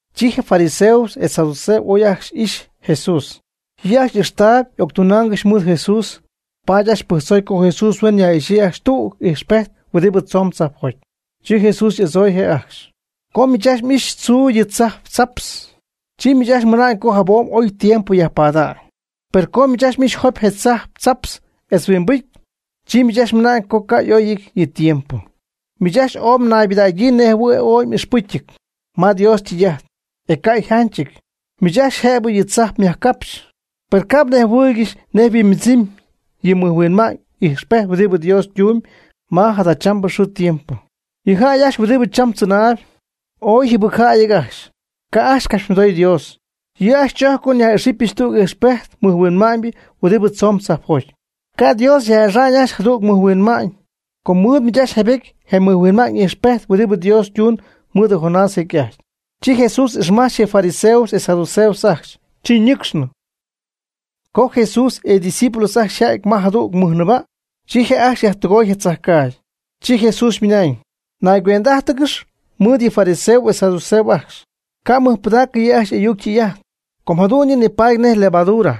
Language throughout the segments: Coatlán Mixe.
Chi je fariseos etz saduceos y'oy ajcxy ixy Jesús. Yɨ' ajcxy ijxta'n octunaangɨxy mɨɨd Jesús, paady ajcxy pɨjctzoy co Jesús huen yaj'ixyii ajcxy tüg ijxpejt huɨdibɨ tzomb tzajpjoty. Chi Jesús y'adzooy je' ajcxy: ―Co miich ajcxy m'ixy tzuu yɨ tzajp tzaptz, chi miich ajcxy mɨna'ñ com jabom oy tiempo yajpada'ñ. Per co miich ajcxy m'ixy jopy je tzajp tzaptz etz huimbɨcy, chi ajcxy mɨna'ñ co ca' y'oyɨty yɨ tiempo. Miich ajcxy ooy mnaybɨdägyii nejɨhuɨ̈y ooy m'ixpɨcyɨty ma Dios ytɨy'ajt, e ca' yjanchɨty. Miich ajcxy jëbɨ yɨ tzajp myajcapxy, per ca' mnejhuɨɨygɨxy nej yhuimbɨdzɨmy yɨ mɨjhuinma'ñ ijxpejt huɨdibɨ Dios ytumyb ma jadachambɨ xɨɨ tiempo. Yɨ jäy ajcxy huɨdibɨ cham tzɨnaayb, ooy yjɨbɨcjäyɨty ajcxy, ca' ajcxy capxymɨdoy Dios. Yɨ' ajcxy chojcpy co nyaj'ixɨpyɨch tüg ijxpejt mɨjhuinma'ñ huɨdibɨ tzomb tzajpjoty. Ca' Dios yaj'ixa'ñ ajcxy jadüg mɨjhuinma'ñ, com mɨɨd miich ajcxy jaybetyɨty je mɨjhuinma'ñ ijxpejt huɨdibɨ Dios ytuun mɨɨd Jonás jecy'ajty. Chi Jesús ixmajch je fariseos etz saduceos ajcxy, chi ñɨcxnɨ. Co Jesús etz ydiscípulos ajcxy yja'ty ma jadüg nɨɨba', chi je' ajcxy yjäydɨgoy je tzajcaagy. Chi Jesús ymɨnañ: ―Naygüend'ájtɨgɨx mɨɨd yɨ fariseos etz saduceos ajcxy, ca' mɨjpɨdaacɨ yɨ' ajcxy y'ayuc ytɨy'ajt, com jadu'n yɨ' nipaady nej levadura.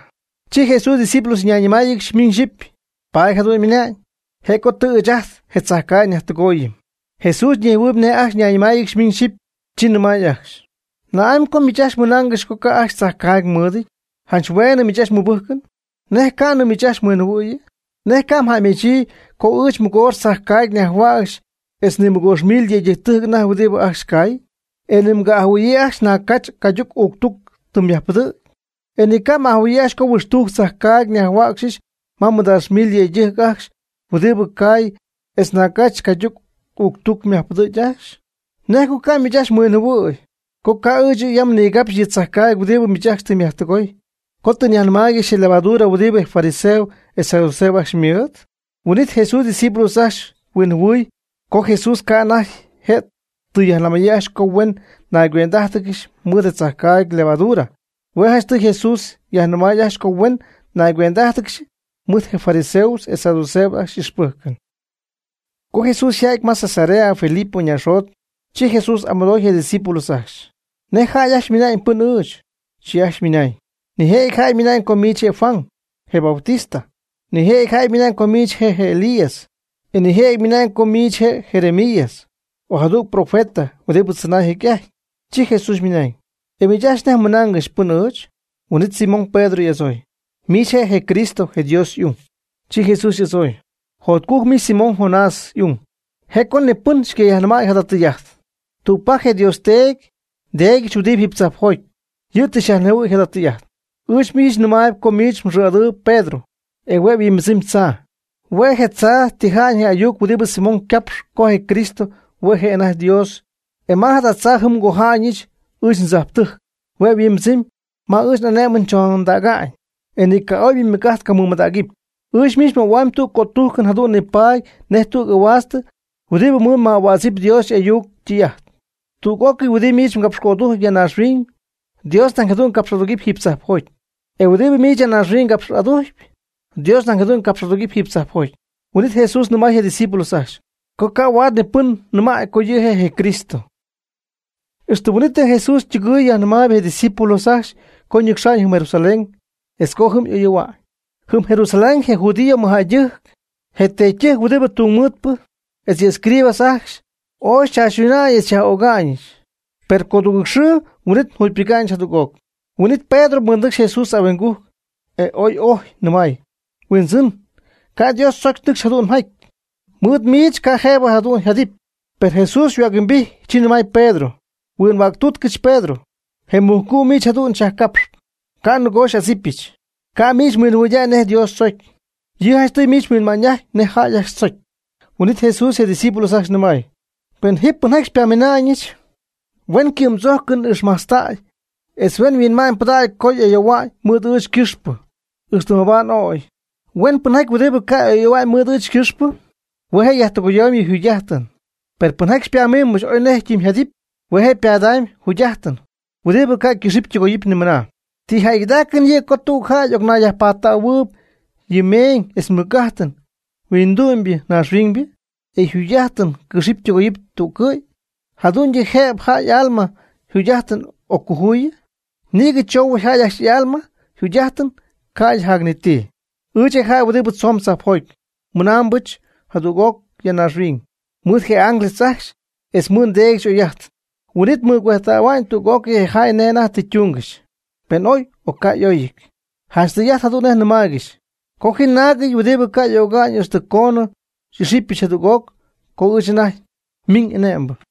Chi Jesús ydiscípulos ñayñɨmáayɨgɨxy miñ xyɨpy: ―Paady jadu'n ymɨnañ, je' co tɨ ɨɨch ajt je tzajcaagy njäydɨgooyɨm. Jesús nejhuɨy nej ajcxy nayñɨmáayɨgɨxy miñ xyɨpy, chi nɨmay ajcxy: ―¿Na'amy co miich ajcxy mɨnaangɨxy co ca' ajcxy tzajcaagy mɨɨdɨty? Janch hueenɨ miich ajcxy mmɨbɨjcɨn. ¿Nej ca'nɨ miich ajcxy mhuinjɨhuɨ̈yɨ? ¿Nej ca' mjäymechyii co ɨɨch mɨgoox tzajcaayg nyajhuäcxy etz ni mɨgoox mil je yëydɨjctɨjc anajty huɨdibɨ ajcxy cay? ¿E ni mga'ajɨhuɨ̈yii ajcxy naag cach cayduc uuctuc tɨ myajpɨdɨ̈gy? ¿E ni mga'ajɨhuɨ̈yii ajcxy co huɨxtujc tzajcaagy nyajhuäcxyɨch ma nimɨdaax mil yëydɨjc ajcxy huɨdibɨ caay etz naag cach cayduc uuctuc myajpɨdɨ̈gy ajcxy? ¿Nej co ca' miich ajcxy mhuinjɨhuɨ̈y, co ca' ɨɨch yam nigapxy yɨ tzajcaagy huɨdibɨ miich ajcxy tɨ mjäydɨgoy, co tɨ nyajnɨmaaygɨxy je levadura huɨdibɨ je fariseos etz saduceos ajcxy ymɨɨd? Huin'it Jesús ydiscípulos ajcxy huinjɨhuɨy co Jesús ca' anajty je' tɨ yajnɨmäyii ajcxy co huen naygüend'ájtɨgɨxy mɨɨd tzajcaagy levadura. Hue' janchtɨy Jesús yajnɨmay ajcxy co huen naygüend'ájtɨgɨxy mɨɨd je fariseos etz saduceos ajcxy y'ixpɨjcɨn. Co Jesús yja'ty ma Cesarea Filipo naaxjot, chi Jesús y'amɨdooy je' ydiscípulos ajcxy: ―¿Nej jäy ajcxy ymɨna'ñ, pɨ́nɨc ɨɨch? Chi ajcxy ymɨna'ñ: ―Nijëjɨty jäy ymɨna'ñ co miich je' Juan je Bautista. Nijëjɨty jäy ymɨna'ñ co miich je' Elías, e nijëjɨty ymɨna'ñ co miich je' Jeremías o jadüg profeta (huɨdibɨ tzɨnay jecy'ajty). Chi Jesús ymɨnañ: ―¿E miich ajcxy nej mɨnaangɨxy, pɨn ɨɨch? Huin'it Simón Pedro y'adzooy: ―Miich je' je Cristo, je Dios y'ung. Chi Jesús y'adzooy: ―Jotcujc miich Simón, Jonás y'ung, je' co ni pɨn xycayajnɨmäy jada tɨy'ajt, tügpajc je Dios Teedy nDeedyɨch huɨdibɨ jiiby tzajpjoty, yɨ' tɨ xyajnejhuɨ̈y jada tɨy'ajt. Ɨɨch miich nɨmaayb co miich mxɨɨ'adɨɨyb Pedro, e hue' yhuimbɨdzɨmy tzaa (hue' je', je tzaa tija'ñ je ayuc huɨdibɨ Simón ycapxy co je Cristo hue' je' anajty Dios), e ma jada tzaa ji ngoja'ñɨch ɨɨch ndzajptɨjc (hue' yhuimbidzɨmy, ma ɨɨch n'ane'mɨn chondäga'ñ), e ni ca' oybɨ ymɨc'ajt ycamɨmadägɨpy. Ɨɨch miich nmöhuamyb je cötujcɨn jadu'n nipaady nej tüg ahuaast huɨdibɨ mɨɨd myaj'ahuädzɨpy Dios y'ayuc ytɨy'ajt. Tüg'ócɨy huɨdibɨ miich mgapx'adujcpy ya naaxhuiñ, Dios nañ jadu'n capx'adugɨpy jiiby tzajpjoty, e huɨdibɨ miich ya naaxhuiñ ca' capx'aducy, Dios nañ ca' capx'adugɨpy jiiby tzajpjoty. Huin'it Jesús nɨmay je' ydiscípulos ajcxy, co ca' huaad ni pɨn nɨmäy co yɨ' je' je Cristo. Ixtɨ huin'itnɨ Jesús ytɨgɨɨy yajnɨmay je' ydiscípulos ajcxy co nɨcxamb jɨm Jerusalén etz co jɨm ooy y'ayoohua'ñ. Jɨm Jerusalén je judío mɨjjäydɨjc, je teedytɨjc huɨdibɨ tungmɨɨdpɨ, etz yɨ escribas ajcxy ooy chaachytuna'ñyii etz yaj'öga'ñyii. Per codugɨɨg xɨɨ huin'it yjugypɨga'ñ jadüg'oc. Huin'it Pedro mɨɨdnɨcxy Jesús ahuingujc, e oy ojy, ymɨnañ: ―Huindzɨn, ca' Dios tzocy nɨcx jadu'n mjaty. Mɨɨd miich ca' jëbɨ jadu'n mjadɨpy. Per Jesús yhuäc-huimbijty, chi nɨmay Pedro: ―Huinhuäctuutcɨch Pedro, je mujcu' miich jadu'n xyajcapxp. Ca' nɨgoo xy'adzipyɨch. Ca' miich mhuinma'ñybɨdägy nej Dios tzocy. Yɨ' janchtɨy miich mhuinma'ñ'ajtpy nej jäy ajcxy tzocy. Huin'it Jesús je' ydiscípulos ajcxy nɨmay: ―Pen je pɨnjaty xypamina'ñɨch, huen ycɨ'mdzojcɨn ixmajtztäy etz huen yhuinma'ñypɨdägy co ayoohuɨpy mɨɨd ɨɨch ycɨxpɨ, ixtɨ mabaad y'ögy. Huen pɨnjäy huɨdibɨ ca' ayoohua'ñ mɨɨd ɨɨch ycɨxpɨ, hue' je' yajtɨgoyamy yɨ' yjugy'ajtɨn. Per pɨnjaty xypanɨcxpɨch oy nej ytɨmyjadɨpy, hue' je' ypadamyb yjugy'ajtɨn huɨdibɨ ca' ycɨxɨpy ytɨgoyɨpy nimɨna. ¿Ti jäygɨdaacɨn yɨ' co tüg jäy y'ocnayyajpadɨɨyb yɨ meeñ etz mɨc'ajtɨn huindu'my ñaaxhuiñybɨ, e yjugy'ajtɨn cɨxɨpy tɨgoyɨpy tüccɨ'y? ¿Jadu'ñyɨ jëbɨ jäy y'alma yjugy'ajtɨn occojuyɨ? Nïgɨ choohuɨty jäy ajcxy y'alma yjugy'ajtɨn, ca'ydɨ jac ni ti. Ɨɨch, je jäy huɨdibɨ tzoon tzajpjoty, miinaambɨch jadüg'oc ya naaxhuiñ mɨɨd je ángeles ajcxy etz mɨɨd nDeedyɨch y'oy'ajtɨn. Huin'it mɨcuejtähua'ñ tüg'ócɨy je jäy nej anajty tɨ ytuungɨxy, pen oy, o ca' y'oyɨty. Janch tɨy'ajt jadu'n nej nɨmaaygɨxy co ji ya naagɨty huɨdibɨ ca' y'öga'ñ ixtɨ coonɨ xy'ixɨpyɨch jadüg'oc co ɨɨch anajty nmiiñ ane'mbɨ.